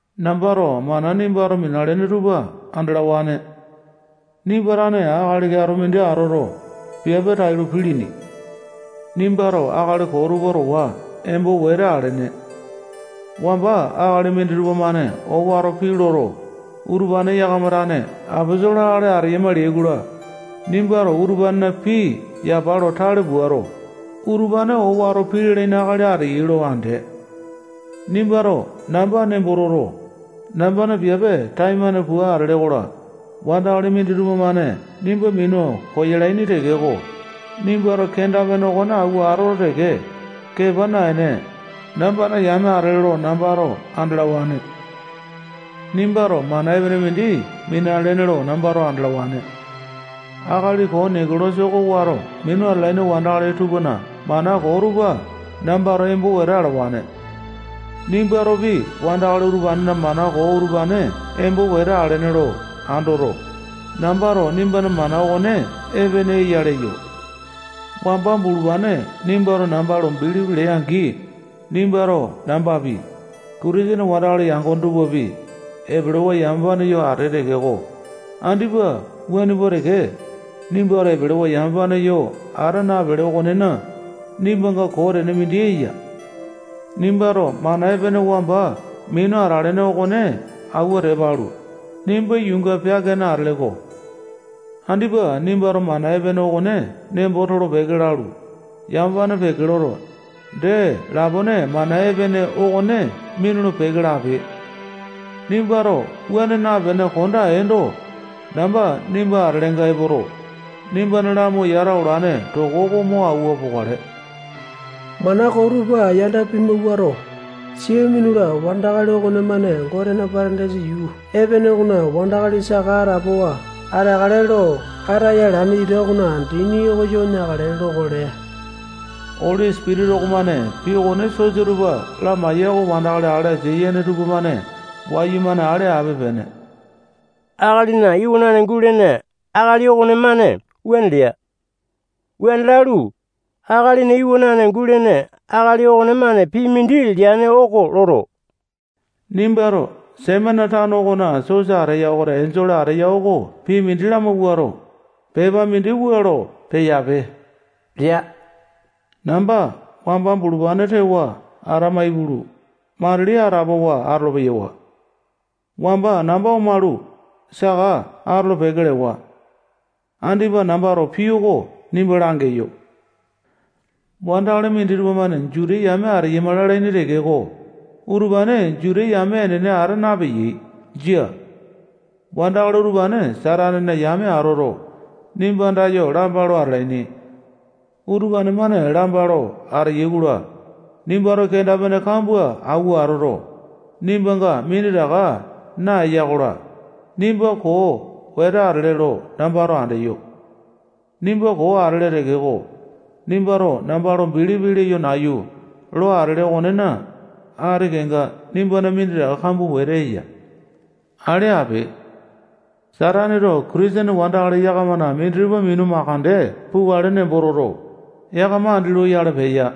Nambato mana nimbato minalene tupa andalawane. Nimba tane akali keato mindi atoto, piape tailo pilini. Nimbato akali koo tupa towa embo wete alene. Wamba akali minditupa-mane owato pii loto, utupane yakama tane aposolo akali ateyama leai-kola, nimbato utupanena pii yapa lo tale puato, utupane owato pii lalaini akali ateyai lo andee. Nimbato namba nembo toto, nambana piape taimane pua atele-kola, wandakali minditupa-mane nimba minu koyalaini tekeko, nimbato kenda-pene okone auwa atoto teke, kepa naene, nambana yame atele lo nambato andalawane. Nimbato mana epene mindi minalene lo nambato andalawane. Akali koo Nekolasa oko wato minu atalaini wandakali tupana mana koo tupa nambato embo wete alawane. Nimbatopi wandakali utupanena mana koo utupane embo wete alene lo andoto, nambato nimbana mana okone epene eya leyo. Wamba bulupane nimbato namba lo bilipi lee-angi, nimbato nambapi, Kitisene wandakali yangone tupapi, epelewa yamapane yo atee tekeko, andipa wuane pua teke, nimbato epelewa yamapane yo ata napele okonena, nimbanga koo tene mindi eya. Nimbato mana epene wamba minu atalene okone auwa tepa alu, nimba yuunga peaka-ene atele-ko. Andipa nimbato mana epene okone nembo tolo-peke lalu, yamapane peke loto, dee lapone mana epene okone minulu-peke lape. Nimbato wuane napene konda eendo, namba nimba atelenga epoto, nimbana lamu yata olane toko oko mo auwa pokale. Mana koo tupa yanda pimawuato, sia minula wandakali okonemane Gotena Patandaisa yuu epene okona wandakali saka atapowa ateakale lo ataya alane ita okona dini oko yo neakale lokale. Oli Sipitisa okomane pii okone sosa tupa lamaeya oko wandakali ale asia yene tupamane wayumane ale ape-pene. Akalina Iwanane gulene akali okonemane wuane lea. Wuane lalu, Akalina Iwanane gulene akali okonemane pii mindi leane oko loto, nimbato Semena tano okona sosa ateya okona enjole ateya oko pii mindi lamawuato, pepa mindi wua lo peyape lea. Namba wamba bulupane tewa atama ipulu, matilipi atapowa atolo-peyawa. Wamba namba omalu, saka atolo-peke lewa. Andipa nambato pii oko nimba langeyo. Wandakali minditupa-mane Juta yame ateyama lalaini tekeko, utupane Juta yame enene ata napeyai. Jia. Wandakali utupane Satanena yame atoto, nimba andayo lamba lo atalaini. Utupane-mane lamba lo ateyai-kola, nimbato kenda-pene kambua auwa atoto, nimbanga minditaka naeya-kola, nimba koo wete atele lo nambato andeyo. Nimba koo atele tekeko, nimbato namba lo bilipi leyo nayu lo atele okonena, ati kenga nimbana minditaka kambua wete eya. Ale ape. Sataneto Kitisene wandakali yakamana minditupa minu mandeke pukale nembo toto, yakama andi loyale peya.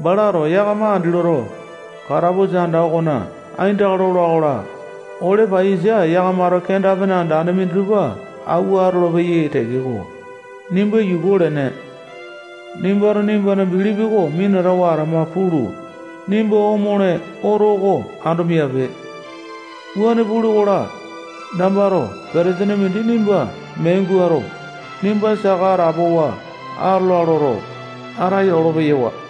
Balato yakama andi loto, katapusa anda okona aindaka lola-kola, ole paiyasa yakamato kenda-pene andane minditupa auwa atolopeyai tekeko, nimba yuku olene. Nimbato nimbana bilipi oko minatawa atama pulu, nimba omole oto oko ando miape. Wuane pule-kola, nambato petesene mindi nimba mee guato, nimba saka atapowa atola loto, ataya olo-peyawa.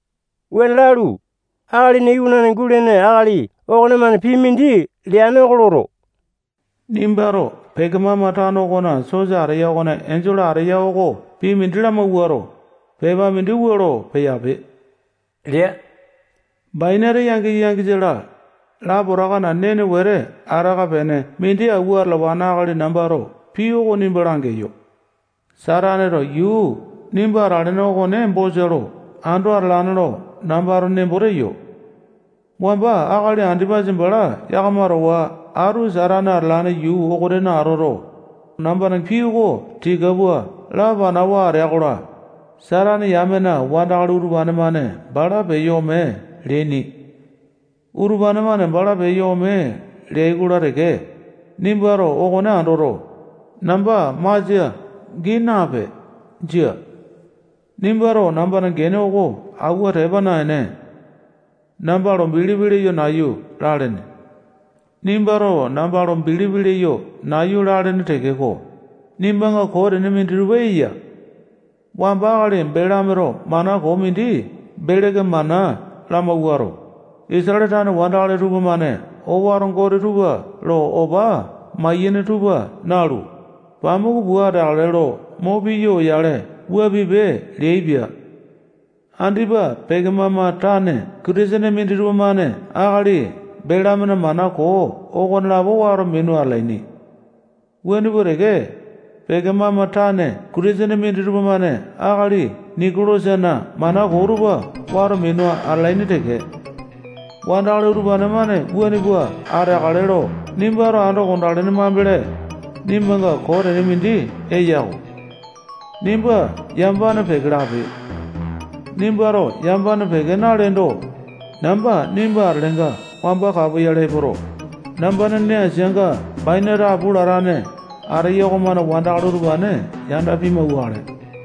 Wuane lalu, Akalina Iwanane gulene akali okonemane pii mindi leane oko loto, nimbato Pekemama tano okona sosa ateya okona enjole ateya oko pii mindi lamawuato, pepa mindi wua lo peyape lea. Bainate yangisa, yangisa-la, lapotakana nene wete ataka pene mindi auwa atalawane akali nambato pii oko nimba langeyo. Sataneto yuu nimba atalene okone bosa lo ando atalane lo nambato nembo teyo. Wamba akali Andipasa bala yakama towa atu Satane atalane yuu okonena atoto, nambana pii oko tika pua lapanawa atea-kola, Satane yamena wandakali utupane-mane bala peyo ome leaini. Utupane-mane bala peyo ome leai-kola teke, nimbato okone andoto, namba masia gii nape. Jia. Nimbato nambana gene oko auwa tepa naene, namba lo bilipi leyo nayu lalene. Nimbato namba lo bilipi leyo nayu lalene tekeko, nimbanga koo tene minditupa eya. Wamba akali Belameto mana koo mindi Beleke mana lamawuato, Isatale tane wandakali tupamane owato gote tupa lo opa maiyene tupa nalu, pamuku pua ateakale lo mo piya oyale wua pipe leaipia. Andipa Pekemama tane Kitisene minditupa-mane akali Belamena mana koo okonelapo wato minu atalaini. Wuane pua teke, Pekemama tane Kitisene minditupa-mane akali Nikolasana mana koo tupa wato minu atalaini teke. Wandakali utupane-mane wuane pua ateakale lo nimbato ando konda alene mambele, nimbanga koo tene mindi eya-ko. Nimba yamapane peke lape. Nimbato yamapane peke naleendo, namba nimba atelenga wamba kapoyale epoto, nambana nee asianga bainate apu latane ateya okomane wandakali utupane yanda pimauwakale.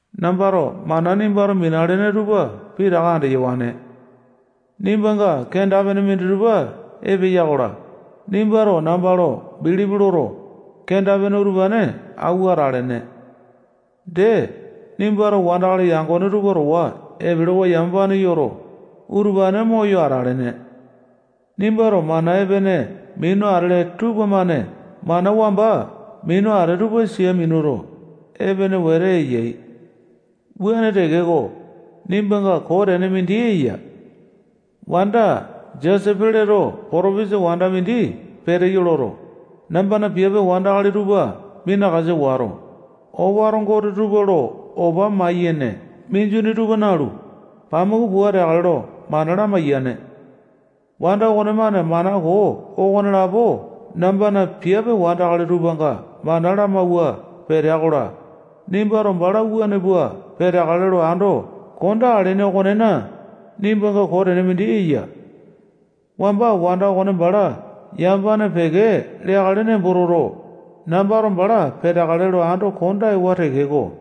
Nambato mana nimbato minalene tupa pitaka andeyawane. Nimbanga kenda-pene minditupa epeya-kola, nimbato namba lo bilipi loto, kenda-pene utupane auwa atalene. Dee, nimbato wandakali yangone tupa towa epelewa yamapane yoto, utupane moyo atalene. Nimbato mana epene minu atele tupamane mana wamba minu atee tupa sia minuto, epene wete eyai. Wuane tekeko, nimbanga koo tene mindi eya. Wanda Jesepeleto potopesa wanda mindi peteyo loto, nambana piape wandakali tupa minakasa wato, owato gote tupa lo opa maiyene minjuni tupa nalu, pamuku pua ateakale lo mana lamaiyane. Wanda okonemane mana koo okonelapo nambana piape wandakali tupanga mana lamauwa peteya-kola, nimbato bala wuane pua peteakale lo ando konda alene okonena, nimbanga koo tene mindi eya. Wamba wanda okone bala yamapane peke leakale nembo toto, nambato bala peteakale lo ando kondewa tekeko,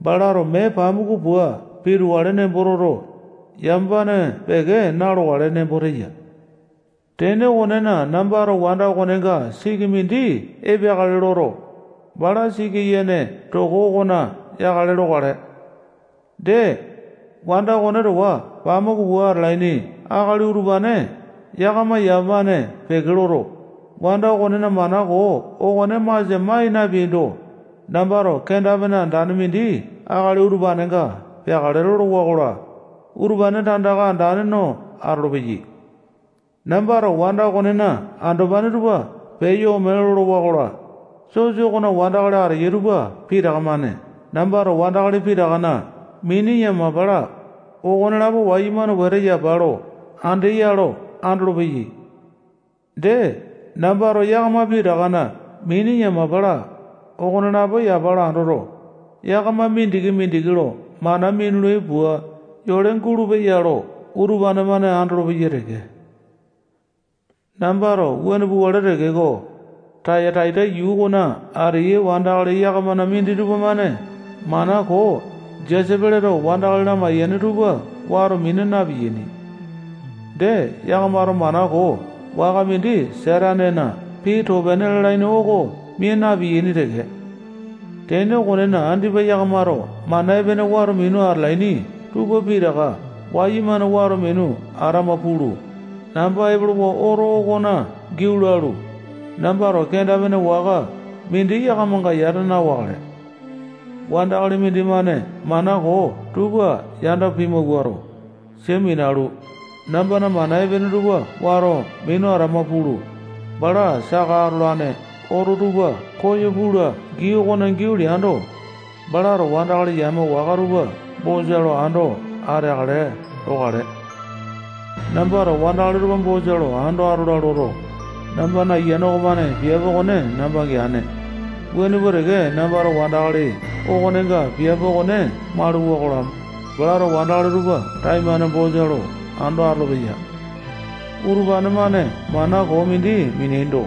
balato mee pamuku pua pitukale nembo toto, yamapane peke na-lokale nembo teya. Tene okonena, nambato wanda okonenga siki mindi epeakale loto, bala siki yene toko okona yakale lokale. Dee, wanda okone towa pamuku pua atalaini akali utupane yakama yamapane peke loto, wanda okonena mana koo okone masia mai napeaindo, nambato kenda-pene andane mindi akali utupanenga peakale lolowa-kola, utupane tandaka andane no atolopeyai. Nambato wanda okonena andopane tupa peyo ome lolowa-kola, sosa okona wandakali ateyai tupa pitaka-mane nambato wandakali pitakana mini yamapa-la, okonelapo wayumane wete yapa lo andeya lo andolopeyai. Dee, nambato yakama pitakana mini yamapa-la, okonelapo yapa lo andoto, yakama mindiki-mindiki lo mana minulai pua yole gulupeya lo utupane-mane andolopeyai teke. Nambato wuane pukale tekeko, Tayataita yuu okona ateyai wandakali yakamana minditupa-mane mana koo Jesepeleto wandakali lamaiyane tupa wato mina na-piyaini. Dee, yakamato mana koo waka mindi Satanena pii too-pene lalaini oko mia napeaini teke. Tene okonena, andipa yakamato mana epene wato minu atalaini tupa pitaka wayumane wato minu atama pulu, namba epolowa oto okona giau lalu, nambato kenda-pene waka mindi yakamanga yata na-wakale. Wandakali mindimane mana koo tupa yanda pimawuato, sia minalu, nambana mana epene tupa wato minu atama pulu, bala saka atolane oto tupa koyo pula gii okona giau leando, balato wandakali yame waka tupa bosa lo ando ateakale lokale. Nambato wandakali tupa bosa lo ando atola loto, nambana Ayiane okomane piape okone namba geane, wuane pua teke nambato wandakali okonenga piape okone mauluwa-kola, balato wandakali tupa taimane bosa lo ando atolopeya. Utupane-mane mana koo mindi mineaindo,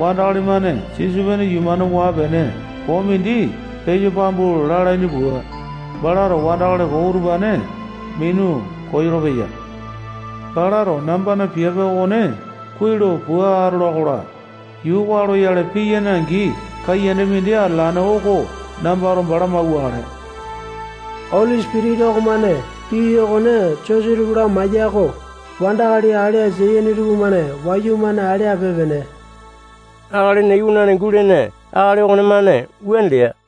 wandakali-mane sisopene yuu-mane waa-pene koo mindi peyo pambu lalaini pua, balato wandakali koo utupane minu koyolo-peya. Balato nambana piape okone kuai lo pua atola-kola, yuu waa loyale piyane-angi kaiyanda mindi atalane oko nambato bala mauwakale. Oli Sipitisa okomane pii okone sosa tupa lamaeya oko wandakali ale asia yene tupamane wayumane ale ape-pene. Akalina Iwanane gulene akali okonemane wuane lea.